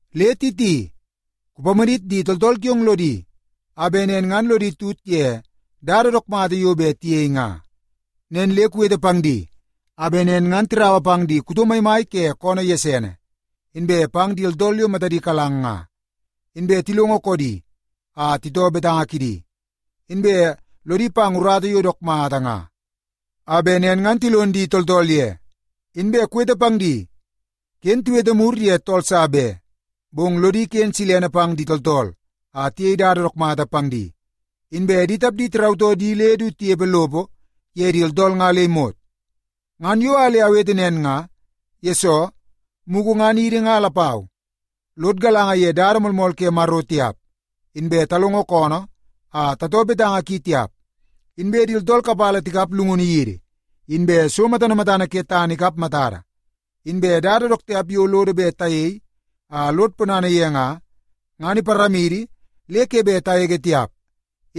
Le Titi, kupamadit di tooltool kiong lodi a bet nen ngan lodi tut ye dada dook mata yo bet tiyei nga. Nen le kuwete pang di a bet nen ngan tiraua pang di kuto maimai ke koonoo gesene inbe pang di tooltool yo matadi kalang nga, inbe tilongo koodi a titoo betanga kidi, inbe lodi pang urata yo dook mata nga a bet nen ngan tilon di tooltool ye. Inbe kuwete pang di, ken tiwete mur ye tool sa be, bong lodi ken silene pang di tooltool a tiyei dada dook mata pang di, inbe di tapdi tirautoo di le du tinepe lopo ye di tooltool nga le imot. Ngan yo a le awete nen nga, yesoo mugu ngan idi nga lapau lod galanga ye dada moolmool ke Maro tiap, inbe talongo koonoo a tatoo betanga ki tiap, inbe di tooltool kapala tikap llungunu yidi, inbe so matana matana ke tana ikap matada, inbe dada dook tiap yo lodo bet tayei a lod ponana ye nga, ngan iparamidi le ke bet tagege tiap.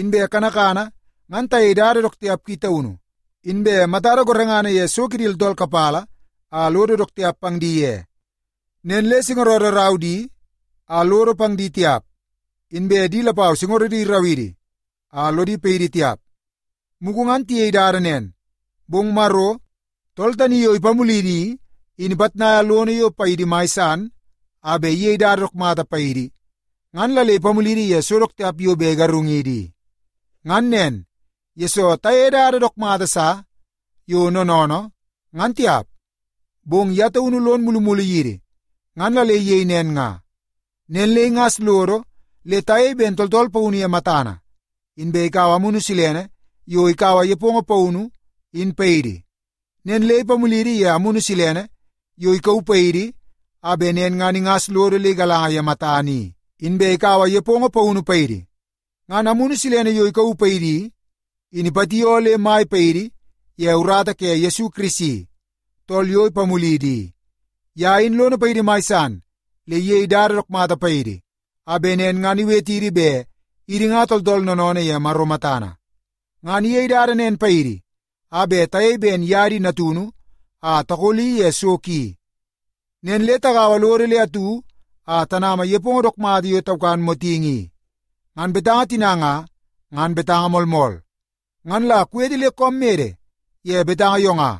Inbe kanakana ngan tayei dada dook tiap ki taunu, inbe matada gorengana ye so kidi tooltool kapala a lodo dook tiap pang di ye. Nen le singorodo rau di a lodo pang di tiap, inbe di lapau singorodi irau idi a lodi paidi tiap. Mugu ngan tayei dada nen, bong Maro, tool tani yo ipamulidi i, in ipitnaia lono yo paidi mai san a bet iyei dada dook mata paidi ngan la le ipamulidi ye so dook tiap yo bet igarungidi i. Ngan nen, yesoo tayeie dada dook mata sa yo noonoonoo, ngan tiap, bong ye taunu lon mulumulu yidi ngan la le iyei nen nga. Nen le ingas lodo le tayei ben tooltool paunu ye matana, inbe ikaua Amunu Silene yo ikaua nepongo paunu, in paidi. Nen le ipamulidi ye Amunu Silene yo ikauu paidi a bet nen ngan ingas lodo le igalanga ye matana i, inbe ikaua nepongo paunu paidi. Ngan Amunu Silene yo ikauu paidi i, in ipatioo le mai paidi ye urata ke Yesu Kirisi, tool yo ipamulidi i. Ye in lono paidi mai san le iyei dada dook mata paidi a bet nen ngan iwetidi ben idi nga tooltool noonoonoo ye Maro matana. Ngan iyei dada nen paidi a bet tayei ben ye di natunu a takoli ye so ki. Nen le tagaua lodo le atu a tanama nepongo dook mata yo taukan motingi i. Ngan betanga tina nga, ngan betanga moolmool. Ngan la kuwete le koom mede ye betanga yo nga,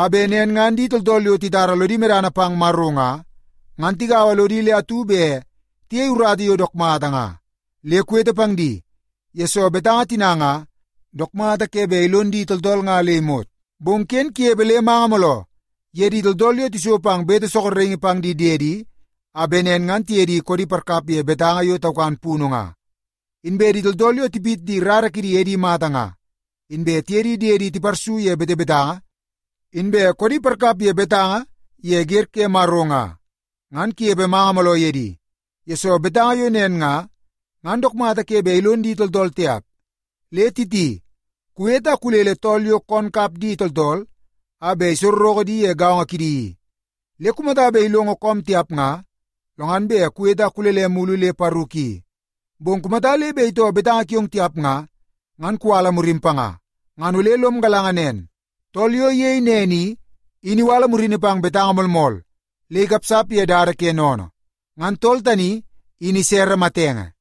a bet nen ngan di tooltool yo titara lodi medana pang Maro nga, ngan tigaua lodi le atu bet tiyei urata yo dook mata nga. Le kuwete pang di, yesoo betanga tina nga dook mata ke bet ilon di tooltool le imot. Bong ken kunepe le manga mooloo ye di tooltool yo tiso pang bete sorokingi pang di diedi a bet nen ngan tiye di koodi parkap ye betanga yo taukan punu nga. Inbe di tooltool yo tipit di rara kidi edi mata nga, inbe tiye di diedi tiparsu ye betebetanga, inbe koodi parkap ye betanga ye wer ke Maro nga, ngan kunepe manga mooloo ye di, yesoo betanga yo nen nga, ngan dook mata ke bet ilon di tooltool tiap. Le Titi, kuwete a kulele tool yo koon kap di tooltool a bet isorreke di ye gaongo kidi i. Le kumata bet ilongo koom tiap nga, lo ngan bet kuwete a kulele mulu le paru ki. Bong kumata le bet itoo betanga kiong tiap nga, ngan kuwala murim panga. Ngan ole lom galanga nen tool yo iyei nen i, in iwala murini pang betanga moolmool le ikapsap ye dada ke sennene. Ngan tool tani in isere matenge.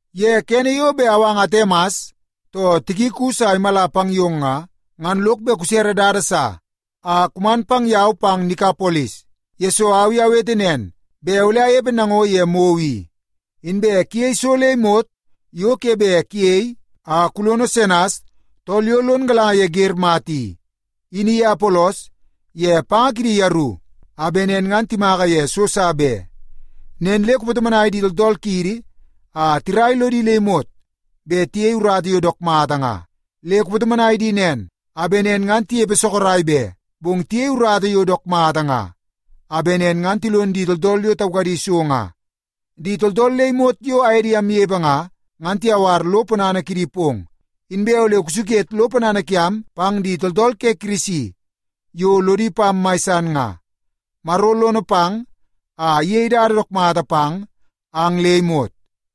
Ye kene yo bet awanga Atemas too Tikikus a imala pang yong nga, ngan lok bet kusere dada sa a kuman pang yau pang Nikapolis, yesoo au i awete nen bet ole anepe nango ye mou i. Inbe kuyei so le imot yo ke bet kuyei a kulono Senas tool yo lon galanga ye wer mata i, in iye Apolos ye panga kidi yeru a bet nen ngan timaka ye so sa be. Nen le kupatomonai di tooltool kiidi a tirai lodi le imot bet tiyei urata yo dook mata nga. Le kupatomonai di nen a bet nen ngan tinepe sorok be, bong tiyei urata yo dook mata nga a bet nen ngan tilon di tooltool yo taukadi so nga. Di tooltool le imot yo aye di amnepe nga, ngan tiyawar lo ponana kidi pong. Inbe ole kusuket lo ponana kiam pang di tooltool ke Kirisi yo lodi pam mai san nga. Maro lono pang a iyei dada dook mata pang ang le imot.